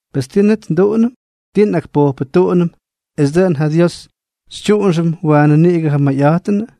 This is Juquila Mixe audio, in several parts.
Pes, ¿ti net nduꞌunʉm? ¿Tii nꞌakpojpʉtuꞌunʉm es dʉꞌʉn ja Dios xytyuꞌunxʉm waanʉ niꞌigʉ ja mayꞌa̱jtʉnʉ?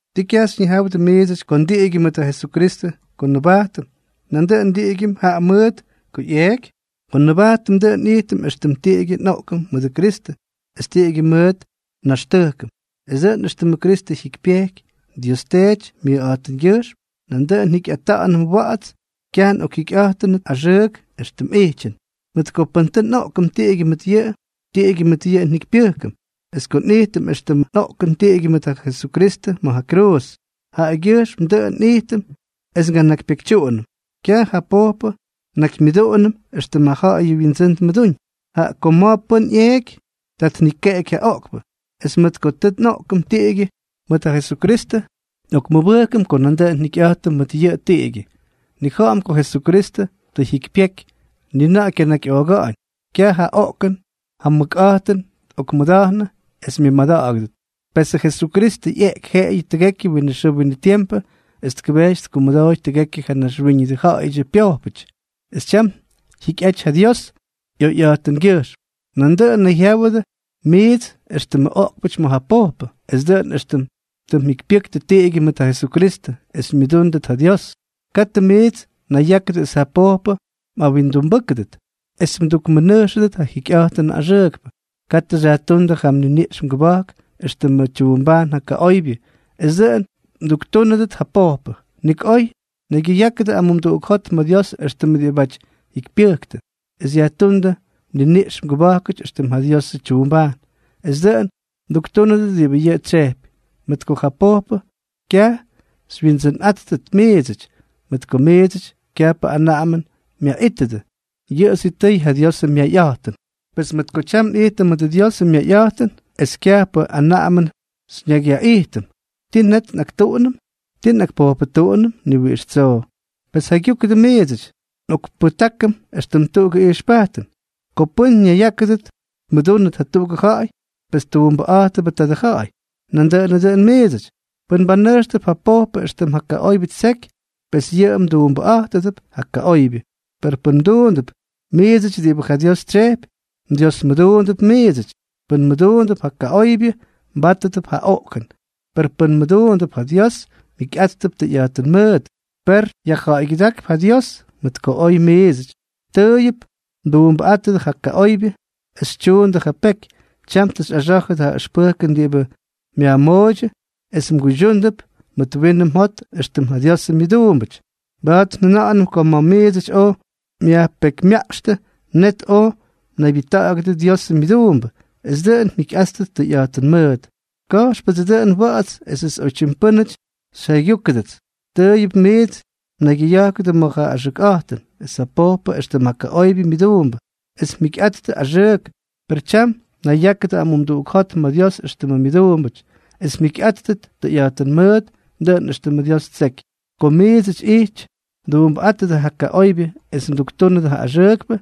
¿Ti kyaj xyñijáwʉdʉ miidsʉty ko ndiꞌigyʉm mʉt ja Jesukristʉ ko nnʉbajtʉm, nandʉꞌʉn ndiꞌigyʉm jaꞌa mʉʉt ko ꞌyeꞌky? Ko nnʉbajtʉm, dʉꞌʉn nꞌijtʉm éxtʉm tiꞌigyʉ nꞌoꞌkʉm mʉdʉ Kristʉ es tiꞌigyʉ mʉt nnaxtʉjkʉm, es dʉꞌʉn éxtʉmʉ Kristʉ jyikypyejky Dios Teety myʉjꞌa̱jtʉngyʉjxm, nandʉꞌʉn njikyꞌata̱ꞌa̱nʉm wa̱ꞌa̱ts, kyaj nꞌokjikyꞌa̱jtʉnʉt axʉʉk éxtʉm ijtyʉn. Mʉt ko pʉn tʉ nꞌoꞌkʉm tiꞌigyʉ mʉt yʉꞌʉ, tiꞌigyʉ mʉt yʉꞌʉ njikypyʉjkʉm. Es ko nꞌijtʉm éxtʉm nꞌoꞌkʉm tiꞌigyʉ mʉt ja Jesukristʉ ma̱ ja kruuz, jaꞌagyʉjxmʉ dʉꞌʉn nꞌijtʉm es nganakypyekytyuꞌunʉm, kyaj ja pojpʉ nnakymyʉduꞌunʉm éxtʉm ja ja̱ꞌa̱yʉ wyindsʉ́n tmʉdúñ. Jaꞌa ko ma̱ pʉ́n ꞌyeeky, ta tnikeꞌeky ja pojpʉ. Es mʉt ko tʉ nꞌoꞌkʉm tiꞌigyʉ mʉt ja Jesukristʉ, nꞌokmʉbʉjkʉm ko nandʉꞌʉn njikyꞌa̱jtʉm mʉt yʉꞌʉ tiꞌigyʉ. Nnija̱ꞌa̱m ko Jesukristʉ tʉ jyikypyeky, ni na̱ꞌa̱ kyanakyꞌooga̱ꞌa̱ñ, kyaj ja oꞌkʉn ja mʉkꞌa̱jtʉn tꞌokmʉda̱jnʉ es myʉmada̱ꞌa̱gʉdʉt. Pesʉ Jesukristʉ ꞌyeꞌky jeꞌeyʉ tʉgekyʉ winʉ xʉʉ winʉ tiempʉ es tkʉbejty tkumʉdooy tʉgekyʉ ja naxwíñʉdʉ ja̱ꞌa̱yʉdyʉ pyojpʉty, es tyam jyikyꞌaty ja Dios ꞌyoyꞌa̱jtʉngyʉjxm. Nandʉꞌʉn nayjyáwʉdʉ miits éxtʉmʉ oꞌkpʉty ma̱ ja pojpʉ, es dʉꞌʉn éxtʉm tʉ mjikypyʉktʉ tiꞌigyʉ mʉt ja Jesukristʉ es xymyʉdúndʉt ja Dios. Katʉ miits mnayyákʉdʉ es ja pojpʉ mꞌawindumbʉ́kʉdʉt es mdukmʉnʉjxʉdʉt ja jikyꞌa̱jtʉnʉ axʉʉkpʉ. Katʉ xyajtúndʉ yʉ mniniꞌx mgʉba̱jkʉty éxtʉmʉ tyuumbajn ja kaꞌoybyʉ es dʉꞌʉn mduktúnʉdʉt ja pojpʉ. Nik oy naygyʉyákʉdʉ amumduꞌuk jot ma̱ Dios éxtʉmʉ diꞌibáty tʉ jyikypyʉktʉ, es yajtúndʉ mniniꞌx mgʉba̱jkʉty éxtʉmʉ ja Diosʉ tyuumbajn, es dʉꞌʉn mduktúnʉdʉt diꞌibʉ yʉꞌʉ tsyejpy. Mʉt ko ja pojpʉ kyaj xywyindsʉnꞌáttʉt miidsʉty, mʉt ko miidsʉty kyajpʉ anaꞌamʉn myaꞌítʉdʉ, yʉꞌʉ sitʉy ja Diosʉ myayꞌa̱jtʉn. Pes mʉt ko tyam nꞌijtʉm mʉdʉ Diosʉ myayꞌa̱jtʉn es kyajpʉ anaꞌamʉn xyñakyyaꞌijtʉm, ¿ti net nꞌaktuꞌunʉm? ¿Tii nꞌakpojpʉtuꞌunʉm? ¡Ni wiꞌix tsoo! Pes jaygyúkʉdʉ miidsʉty. Nꞌokpʉjtákʉm éxtʉm tuꞌugʉ ijxpajtʉn. Ko pʉ́n ñayyákʉdʉt tmʉdúnʉt jatuꞌugʉ ja̱ꞌa̱y, pes tuumbʉꞌa̱jtʉbʉ tadʉ ja̱ꞌa̱y. Nandʉꞌʉnʉ dʉꞌʉn miidsʉty, pʉn mbanʉjxtʉp ja pojpʉ éxtʉm ja kaꞌoybyʉ ttseky, pes yʉꞌʉ mduumbʉꞌa̱jtʉdʉp ja kaꞌoybyʉ. Per pʉn mduundʉp miidsʉty diꞌibʉ ja Dios tsyejpy, mDiosmʉduundʉp miidsʉty. Pʉn mmʉduundʉp ja kaꞌoybyʉ, mbátʉdʉp ja oꞌkʉn. Per pʉn mmʉduundʉp ja Dios, mjikyꞌáttʉp tʉyꞌa̱jtʉn mʉʉt. Per yajja̱ꞌa̱ygyʉdákp ja Dios, mʉt ko oy miidsʉty tʉʉyʉp mduumbʉꞌátʉdʉ ja kaꞌoybyʉ es xytyuundʉ ja peky, tyam tʉ xyꞌaxá̱jʉdʉ ja ʉxpʉjkʉn diꞌibʉ myajmooydyʉ es mguydyuundʉp mʉt winʉ mjot éxtʉm ja Diosʉ myʉduumbʉty. Mba̱a̱t njʉna̱ꞌa̱nʉm ko ma̱ miidsʉty oj myajpekymyaꞌxtʉ, net oj mnaybyʉjta̱ꞌa̱gʉdʉ Diosʉ myʉduumbʉty es dʉꞌʉn mjikyꞌáttʉt tʉyꞌa̱jtʉn mʉʉt. Ka̱jxpʉdsʉ dʉꞌʉn wa̱ꞌa̱ts esʉts oytyim pʉ́nʉty xyjaygyúkʉdʉts. Tʉʉyʉp miits mnaygyʉya̱jkʉdʉ ma̱ ja axʉkꞌa̱jtʉn es ja pojpʉ éxtʉmʉ kaꞌoybyʉ myʉduumbʉ, es mjikyꞌa̱jttʉ axʉʉk; per tyam nayyákʉdʉ amumduꞌuk jot ma̱ Dios éxtʉmʉ myʉduumbʉty, es mjikyꞌáttʉt tʉyꞌa̱jtʉn mʉʉt, dʉꞌʉn éxtʉmʉ Dios ttseky. Ko miidsʉty ijty mduumbʉꞌátʉdʉ kaꞌoybyʉ es mduktúnʉdʉ ja axʉʉkpʉ,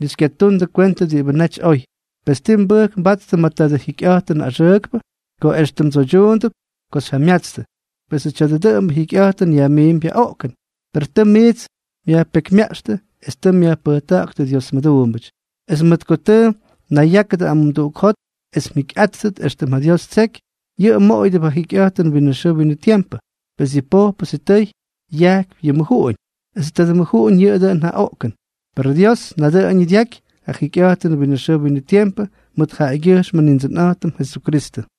ni xykyatuundʉ kwentʉ diꞌibʉ naty oy. Pes, ¿ti mbʉjk mbattʉ ma̱ tadʉ jikyꞌa̱jtʉnʉ axʉʉkpʉ?, ko extʉ mdsoydyuundʉp ko xyjamyatstʉ. Pesʉ tya̱a̱dʉ dʉꞌʉmbʉ jikyꞌa̱jtʉn yajmiimpy ja oꞌkʉn. Per tʉ miits myajpekymyaꞌxtʉ es tʉ myajpʉjta̱ꞌa̱ktʉ Dios mʉduumbʉty. Es mʉt ko tʉ mnayyákʉdʉ amumduꞌuk jot es mjikyꞌáttʉt éxtʉm ja Dios ttseky, yʉꞌʉ mmoꞌoyʉdʉp ja jikyꞌa̱jtʉnʉ winʉ xʉʉ winʉ tiempʉ. Pes yʉ pojpʉ sitʉy yajkypy ja mʉjuꞌuñ, esʉ tadʉ mʉjuꞌuñ yʉꞌʉ dʉꞌʉn ja oꞌkʉn; per Dios nadʉꞌʉñʉ dyaky ja jikyꞌa̱jtʉnʉ winʉ xʉʉ winʉ tiempʉ mʉt jaꞌagyʉjxm Nindsʉnꞌa̱jtʉm Jesukristʉ.